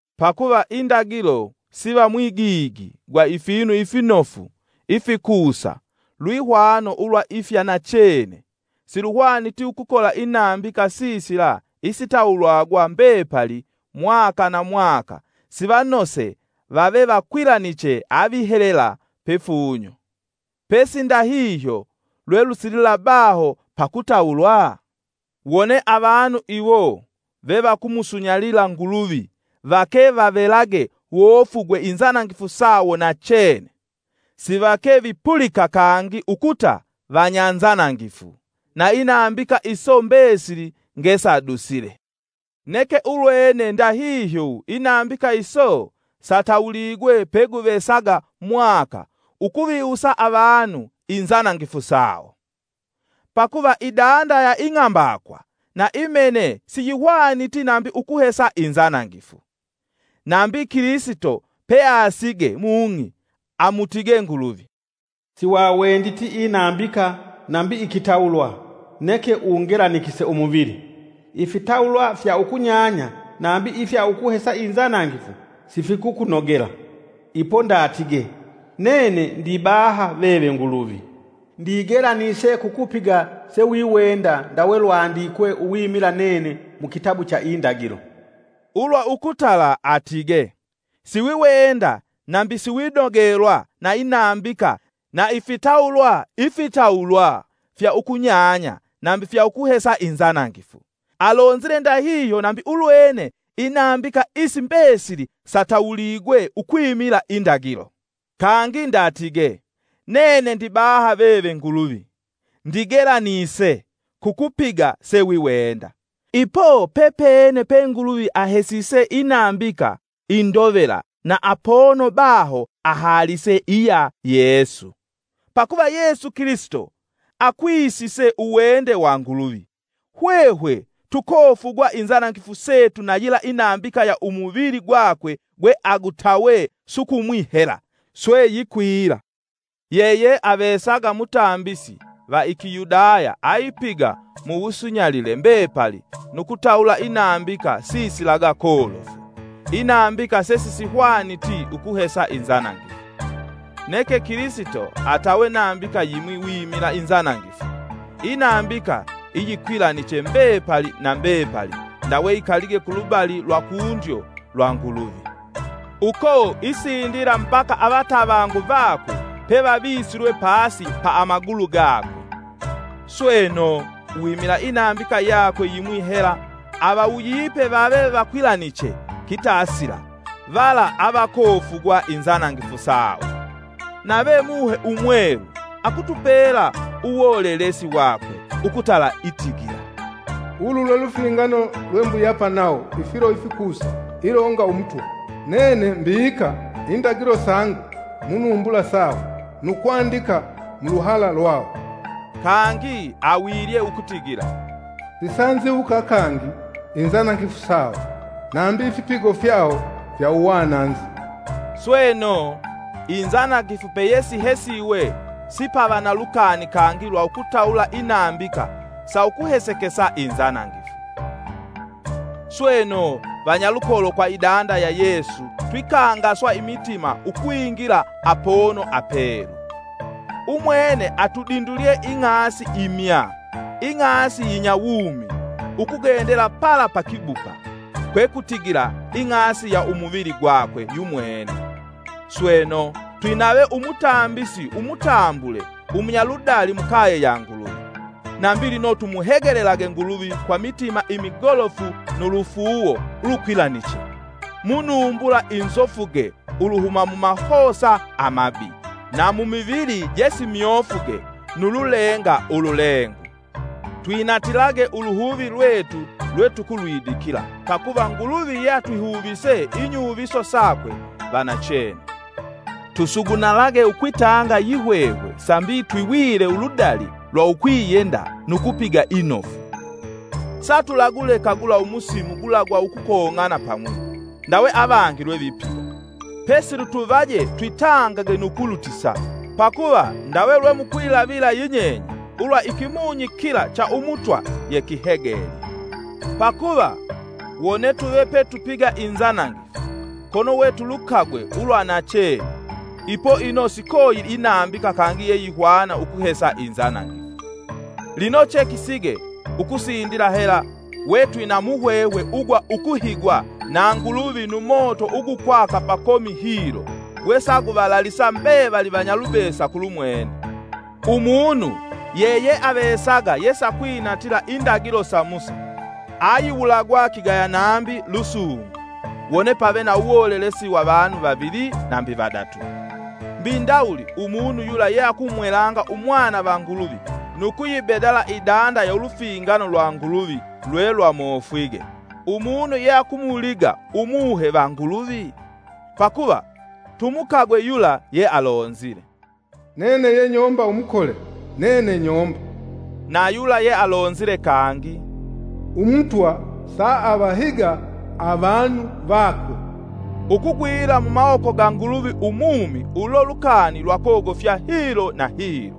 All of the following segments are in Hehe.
Pakuva indagilo siva mwigigi gwa ifinu ifinofu ifikusa lwihwano ulwa ifya nachene, siluhwaniti ukukola inambika sisila isitawulwagwa mbepali mwa na mwaka sivanoose vave vakwilaniche avihelela pifunyo. Pesi ndahihyo lwelusilila baho pakutawulwa? Wone avanu iwo vevakumusunyalila Nguluvi vake vavelage wofugwe inzanangifu sawo nachene, sivake vipulika kangi ukuta vanyanzanangifu, na inambika iso mbesili ngesadusile. Neke ulwene ndahihyo inambika iso satawuligwe peguvesaga mwaka ukuviwusa avanu inzanangifu sawo. Pakuva idanda ya ing'ambakwa na imene siyihwaniti nambi ukuhesa inzanangifu. Nambi Kilisito peasige mung'i, amutige Nguluvi: “Siwawenditi inambika nambi ikitawulwa, neke ungelanikise umuvili. Ifitawulwa fya ukunyanya nambi ifya ukuhesa inzanangifu sifikukunogela. Ipo ndatige: ‘Nene ndibaha veve Nguluvi, ndigelanise kukupiga sewiwenda ndawe lwandikwe uwimila nene mu kitabu cha Indagilo.’” Ulwa ukutala atige, “Siwiwenda, nambi siwinogelwa na inambika na ifitawulwa, ifitawulwa fya ukunyanya nambi fya ukuhesa inzanangifu.” Alonzile ndahihyo nambi ulwene inambika isi mbesili satuwuligwe ukwimila indagilo. Kangi ndatige, “Nene ndibaha veve Nguluvi, ndigelanise kukupiga sewiwenda.” Ipo pepene pe Nguluvi ahesise inambika indovela na apono baho ahaalise iya ya Yesu. Pakuva Yesu Kilisito akwisise uwende wa Nguluvi, hwehwe tukofugwa inzanangifu setu na yila inambika ya umuvili gwakwe gwe agutawe sukumwi hela, swe yikwila. Yeyeavesaga mutambisi va i Kiyudaya aipiga mu wusunyalile mbepali nu kutawula inambika sisilaga kolofu, inambika sesisihwaniti ukuhesa inzanangifu. Neke Kilisito atawe nambika yimwi wimila inzanangifu, inambika iyikwilaniche mbepali na mbepali ndawe ikalige kulubali lwa kundyo lwa Nguluvi. Uko isindila mbaka avatavangu vakwe pevavisilwe pasi ya amagulu gakwe. Sweno, uwimila inambika yakwe yimwi hela avawuyipe vave vakwilaniche kitasila vala avakofugwa inzanangifu sawo. Nave Muhe Umwelu akutupela uwolelesi wakwe, ukutala itigila: “Ulu lwe lufingano lwembuyapa nawo, ifilo ifikusa, ilonga Umutwa: Nene mbika indagilo sangu mu numbula sawo, nu kwandika mu luhala lwawo.” Kangi awilye ukutigila: “Sisanziwuka kangi inzanangifu sawo, nambi ifipigo fyawo fya uwananzi.” Sweno, inzanangifu peyesihesiwe, sipava na lukani kangi lwa ukutawula inambika saukuhesekesa inzanangifu. Sweno, vanyalukolo kwa idanda ya Yesu twikangaswa imitima ukwingila Apono Apelu. Umwene atudindulye ing'asi imya, ing'asi yinyawumi, ukugendela pala pa kibupa, kwekutigila ing'asi ya umuvili gwakwe yumwene. Sweno, twinave Umutambisi umutambule umunyaludali mukaye ya Nguluvi. Nambi lino tumuhegelelage Nguluvi kwa mitima imigolofu nu lufuuwo ulukwilaniche, mu numbula inzofuge uluhuma mu mahosa amabi, na mu mivili jesimyofuge nu lulenga ululengu. Twinatilage uluhuvi lwetu lwetukulwidikila, pakuva Nguluvi yeatwihuvise inyuviso sakwe vanachene. Tusugunalage ukwitanga yihwehwe sambi twiwile uludali lwa ukwiyenda nu kupiga inofu. Satulaguleka gula umusimu gula gwa ukukong'ana pamwi, ndawe avangi lwevipiga. Pesi lutuvaje twitangage nu ukulutisa, pakuva ndawe lwemukwilavila yinyenye, ulwa Ikimunyi kila cha Umutwa yekihegelye. Pakuva, wone tuve petupiga inzanangifu kono we yetulukagwe ulwa nachene, ipo ino sikoyili inambika kangi yeyihwana ukuhesa inzanangifu. Lino chekisige ukusindila hela wetwina muhwehwe ugwa ukuhigwa na Nguluvi nu moto ugukwaka pakomi hilo gwesaguvalalisa mbevali vanyalubesa kulumwene. Umunu yeyeavesaga yesakwinatila indagilo sa Musa, ayiwulagwa kigaya nambi lusungu wone pave na uwolelesi wa vanu vavili nambi vadatu. Mbi ndawuli umunu yula yeakumwelanga Umwana va Nguluvi nu kuyibedala idanda ya ulufingano lwa Nguluvi lwelwamofwige, umunu yeakumuliga Umuhe va Nguluvi? Pakuva tumukagwe yula yealonzile, “Nene yenyomba umukole, nene nyomba,” na yula yealonzile kangi, “Umutwa saavahiga avanu vakwe.” Ukugwila mumawoko ga Nguluvi umumi ulo lukani lwakogofya hilo na hilo!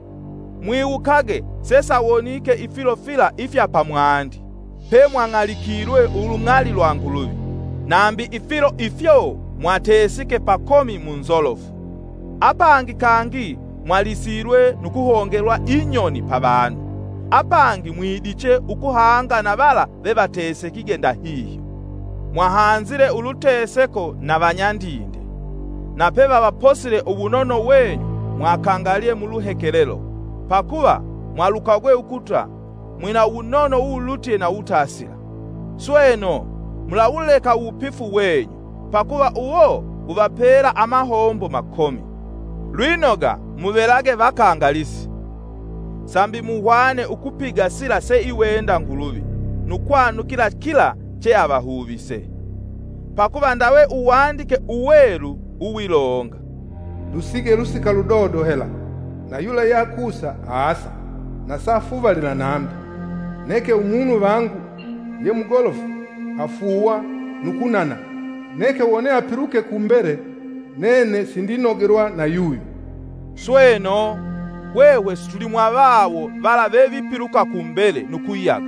Mwiwukage sesawonike ifilo fila ifya pamwandi pemwang'alikilwe ulung'ali lwa Nguluvi. Nambi ifilo ifyo mwatesike pakomi munzolofu. Apangi kangi mwalisilwe nu kuhongelwa inyoni pavanu; apangi mwidiche ukuhanga na vala vevatesekige ndahihyo. Mwahanzile uluteseko na vanyandinde, na pevavaposile uwunono wenyu mwakangalye muluhekelelo, pakuva mwalukagwe ukuta mwina uwunono uwulutye na uwutasila. Sweno, mulawuleka uwupifu wenyu, pakuva uwo wuvapela amahombo makomi, Lwinoga muvelage vakangalisi, sambi muhwane ukupiga sila seiwenda Nguluvi nu kwanukila kila cheahuvise. Pakuva ndawe Uwandike Uwelu uwilonga: “Lusige lusika ludodo hela, na yula yeakusa, aasa, na safuvalila nambi. Neke umunu vangu yemugolofu afuuwa nu kunana; neke wone apiluke ku mbele nene sindinogelwa na yuyo.” Sweno, hwehwe situlimwavawo vala vevipiluka ku mbele nu kuyaga,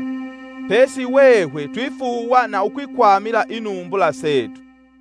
pesi hwehwe twifuuwa na ukwikwamila inumbula setu.